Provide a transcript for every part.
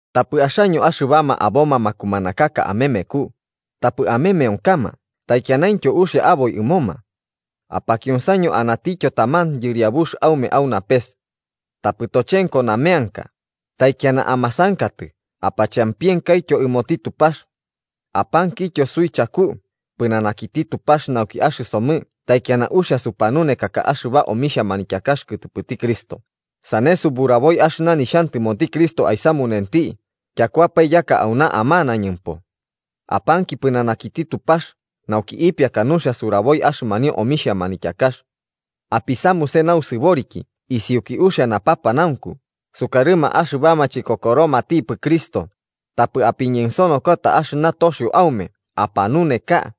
Tapɨ axaño axɨbama aboma makumanakaka amemeku, tapɨ amemeonkama taikianaintyo uxia aboi ɨmoma. Apakionsaño, anatityo taman Yɨriabux aume au napes. Tapɨ tochenko nameanka, taikiana amasankatɨ apachampienkaityo ɨmoti Tupax. Apankityo suichaku, pɨnanakiti Tupax nauki axɨsomɨ taikiana uxia supanunekaka axɨba omixha manityakax kɨtɨpɨti Cristo sane suburaboi axɨna nixhantɨmoti Cristo aisamunenti tyakuapae yaka auna amanañɨmpo. Apanki pɨnanakiti Tupax nauki ipiaka nuxia suraboi axɨmanio omixha manityakax. Apisamuse nausɨboriki isiuki uxia napapanaunku sukarɨma axɨbama chikokoromatipɨ Cristo, tapɨ apiñensonokota axtɨ toxio aume apanuneka.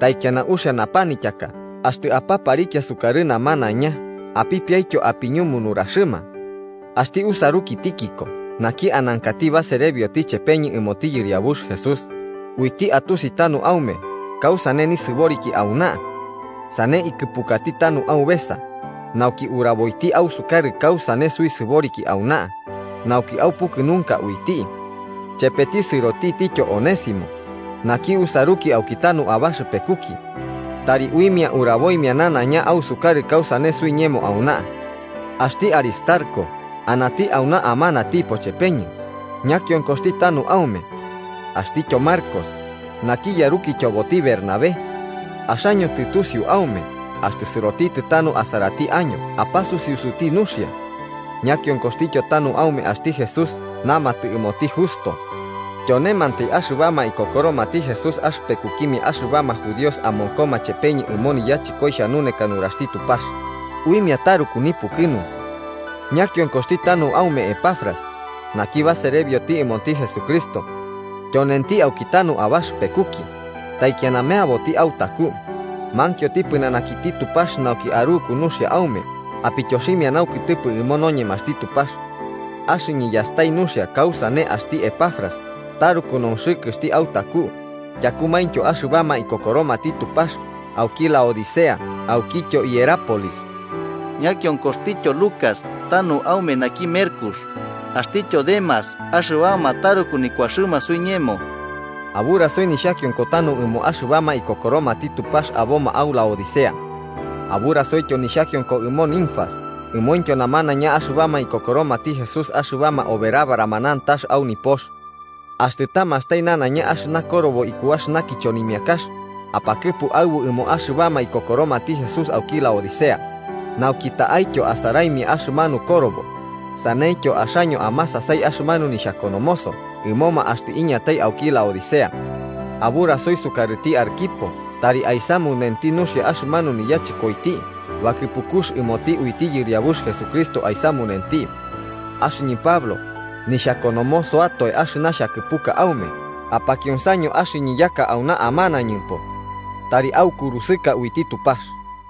Taikiana uxia napanityaka axtɨ apaparikia sukarɨ namanaiña, apipiaityo apiñumu nuraxɨma. Axti usaruki Tíquico naki anankati baserebioti chepeñɨ ɨmoti Yɨriabux Jesús, uiti atusi tanu aume kausane nisɨboriki auna. Sane ikɨpukati tanu aubesa, nauki uraboiti ausukarɨ kausane suisɨboriki auna, nauki aupukɨnunka uiti. Chepeti sɨrotitityo Onésimo, naki usaruki auki tanu abaxɨpekuki. Tari uimia uraboimia nanaiña ausukarɨ kausane suiñemo auna. Axti Aristarco anati auna amanatipo chepeñɨ, ñakionkoxti tanu aume. Axtityo Marcos, naki yarukityoboti Bernabé. Axaño tɨtusiu aume axtɨ sɨrotitɨ tanu asarati año apasusiusuti nuxia. Ñakionkoxtityo tanu aume axti Jesús namatɨ ɨmoti Justo. Tyonemantai axɨbama ikokoromati Jesús axɨpekukimia axɨbama judíos amonkoma chepeñɨ ɨmo niyachɨkoi xhanuneka nuraxti Tupax, uimia taruku nipukɨnunku. Ñakionkoxti tanu aume Epafras, naki baserebioti ɨmoti Jesucristo. Tyonenti aukitanu abaxɨpekuki, taikiana meaboti autaku, mankioti pɨnanakiti Tupax nauki aruku nuxia aume apityoximia naukɨtɨpɨ ɨmo noñemaxti Tupax. Axɨñɨ yastai nuxia kausane axti Epafras taruku nonxɨkɨxti autaku tyakumaintyo axɨbama ikokoromati Tupax auki Laodicea aukityo Hierápolis. Ñakionkoxtityo Lucas tanu aume naki merkux, axtityo Demas axɨbama taruku nikuaxɨma suiñemo. Aburasio nixhakionko tanu ɨmo axɨbama ikokoromati Tupax aboma au Laodicea. Aburasoityo nixhakionko ɨmo Ninfas ɨmointyo namanaiña axɨbama ikokoromati Jesús axɨbama oberabarama nantax au nipox. Axtɨ tamastai nanaiña axɨna korobo iku axɨna kichonimiakax, apakɨpu aɨbu ɨmo axɨbama ikokoromati Jesús auki Laodicea, nauki ta'aityo asaraimia axɨmanu korobo, saneityo axaño amasasai axɨmanu nixhakonomoso ɨmoma axtɨ iñatai auki Laodicea. Aburasoi sukarɨti Arquipo tari aisamunenti nuxia axɨmanu niyachɨkoiti bakɨpukux ɨmoti uiti Yɨriabux Jesucristo aisamunenti. Axɨñɨ Pablo, nixhakonomosoatoe axɨna xhakɨpuka aume. Apakionsaño axɨñɨ yaka auna amanañumpo. Tari aikurusɨka uiti Tupax.